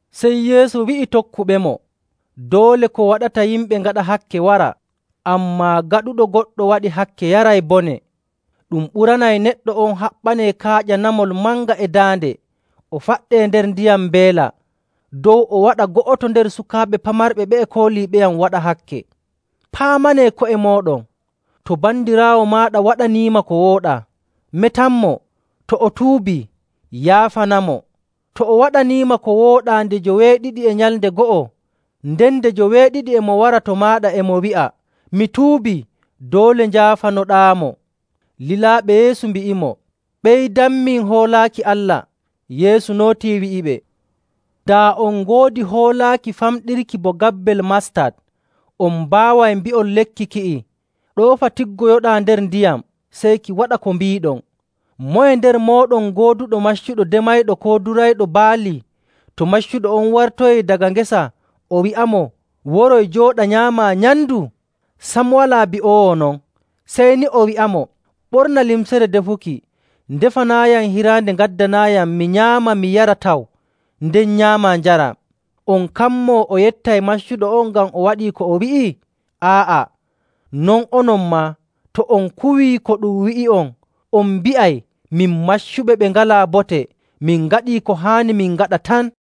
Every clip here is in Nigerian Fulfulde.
Sey Yeesu wi'i tokkuɓemo, “Doole ko waɗata yimɓe ngaɗa hakke wara, ammaa gaɗuɗo goɗɗo waɗi hakke yaray bone. Ɗum ɓuranay neɗɗo on haɓɓanee kaaƴa namol manga e daande o faɗɗee nder ndiyam mbeela, dow o waɗa go'oto nder sukaaɓe pamarɓe ɓe'e kooliiɓeyam waɗa hakke. Paamanee ko'e mooɗon. “To bandiraawo maaɗa waɗaniima ko wooɗaa, metanmo. To o tuubii, yaafanamo.. To o waɗaniima ko wooɗaa nde joweeɗiɗi e nyalnde go'o, nden nde joweeɗiɗi e mo wara to maaɗa e mo wi'a, ‘Mi tuubii,’ doole njaafanoɗaamo.” Lilaaɓe Yeesu mbi'imo, “Ɓeydanmin hoolaaki Allah!” Yeesu nootii wi'iɓe, “Daa on ngoodi hoolaaki famɗirki bo gabbel mastat, on mbaaway mbi'on lekki ki'i, ‘Ɗoofa tiggoyoɗaa nder ndiyam,’ sey ki waɗa bo ko mbiiɗon. “Moye nder mooɗon gooduɗo maccuɗo demayɗo koo durayɗo baali, to maccuɗo on wartoyii daga ngesa o wi'amo, ‘Woroy, jooɗa nyaamaa nyamndu?’ Sam walaa bi'oowo non, sey ni o wi'amo, ‘Ɓorna limcere defuki, ndefanaayam hiraande, ngaddanaayam, mi nyaama mi yara taw, nden nyaamaa njaraa.’ On kammoo o yettay maccuɗo on ngam o waɗii ko o wi'i? Aa'a. Non onon maa, to on kuwii ko ɗum wi'i'on, on mbi'ay, ‘Min maccuɓe ɓe ngalaa bote. Min ngaɗii ko haani min ngaɗa tan.’”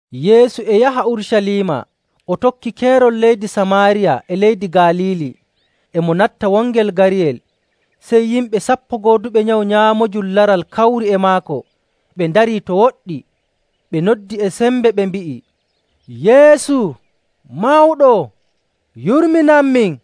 Yeesu e yaha Urucaliima, o tokki keerol leydi Samaariya e leydi Galiili. E mo natta wongel gariyel, sey yimɓe sappo gooduɓe nyawu nyaamoojum laral kawri e maako, ɓe ndarii to woɗɗi. Ɓe noddi e sembe, ɓe mbi'i, “Yeesu! Mawɗo! Yurminanmin!”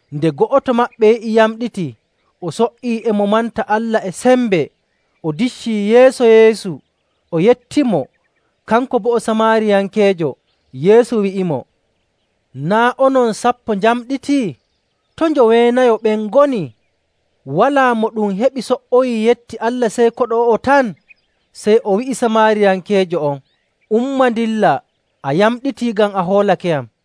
Nde go'oto maɓɓe yi'i yamɗitii, o so''ii e mo manta Allah e sembe. O diccii yeeso Yeesu, o yettimo. Kanko boo o Samaariyankeejo. Yeesu wi'imo, “Naa' onon sappo njamɗiti? To njoweenayo ɓen ngoni? Walaa mo ɗum heɓi so''oyii yetti Allah sey koɗo o'o tan?” Sey o wi'i Samaariyankeejo on, “Umma ndillaa. A yamɗitii ngam a hoolakeyam.”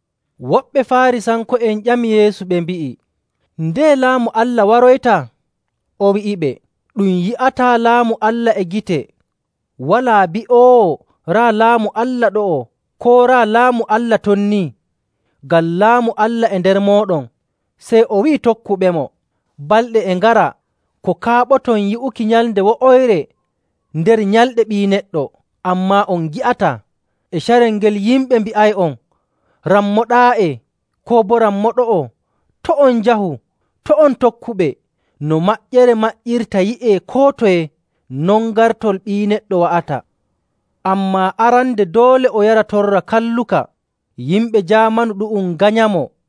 Woɓɓe Faarisanko'en ƴami Yeesu ɓe mbi'i, “Ndeye Laamu Allah waroyta?” O wi'iɓe, “Ɗum yi'ataa Laamu Allah e gite. Walaa bi'oowo, ‘Raa Laamu Allah ɗo'o,’ koo ‘Raa Laamu Allah ton nii,’ ngam Laamu Allah e nder mooɗon.” Sey o wi'i tokkuɓemo, “Balɗe e ngara ko kaaɓoton yi'uki nyalnde wo'oyre nder nyalɗe Ɓii Neɗɗo, ammaa on ngi'ataa. E carel ngel yimɓe mbi'ay'on, ‘Rammo ɗaa'e!’ koo boo, ‘Rammo ɗo'o!’ To' on njahu. To' on tokkuɓe. No maƴƴere maƴƴirta yi'ee koo toye, non gartol Ɓii Neɗɗo wa'ata. Ammaa arande doole o yara torra kalluka, yimɓe jaamanu ɗu'um nganyamo.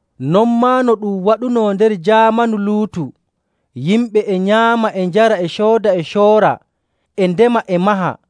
Non maa no ɗum waɗuno nder jaamanu Luutu. Yimɓe e nyaama, e njara, e cooda, e coora, e ndema, e maha.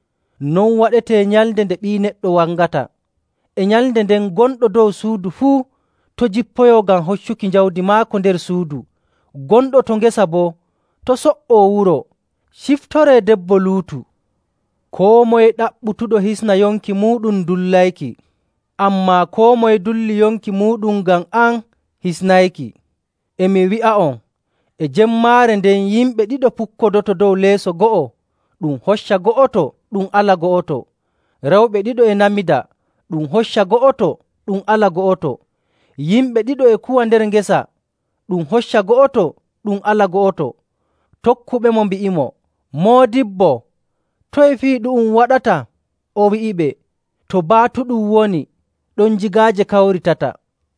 Non waɗetee nyalnde nde Ɓii Neɗɗo wangata. “E nyalnde nden gonɗo dow suudu fuu to' jippoyoo ngam hoccuki jawdi maako nder suudu. Gonɗo to ngesa boo to' so''oo wuro.. Ciftoree debbo Luutu!. Koo moye ɗaɓɓutuɗo hisna yonki muuɗum dullayki, ammaa koo moye dulli yonki muuɗum ngam am hisnayki.. E mi wi'a'on, e jemmaare nden yimɓe ɗiɗo pukkodoto dow leeso go'o ɗum hocca go'oto, ɗum ala go'oto. Rewɓe ɗiɗo e namida, ɗum hocca go'oto, ɗum ala go'oto. [Yimɓe ɗiɗo e kuwa nder ngesa, ɗum hocca go'oto, ɗum ala go'oto.]” Tokkuɓemo mbi'imo, “Moodibbo, toye fii ɗu'um waɗata?” O wi'iɓe, “To baatuɗum woni, ɗon jigaaje kawritata.”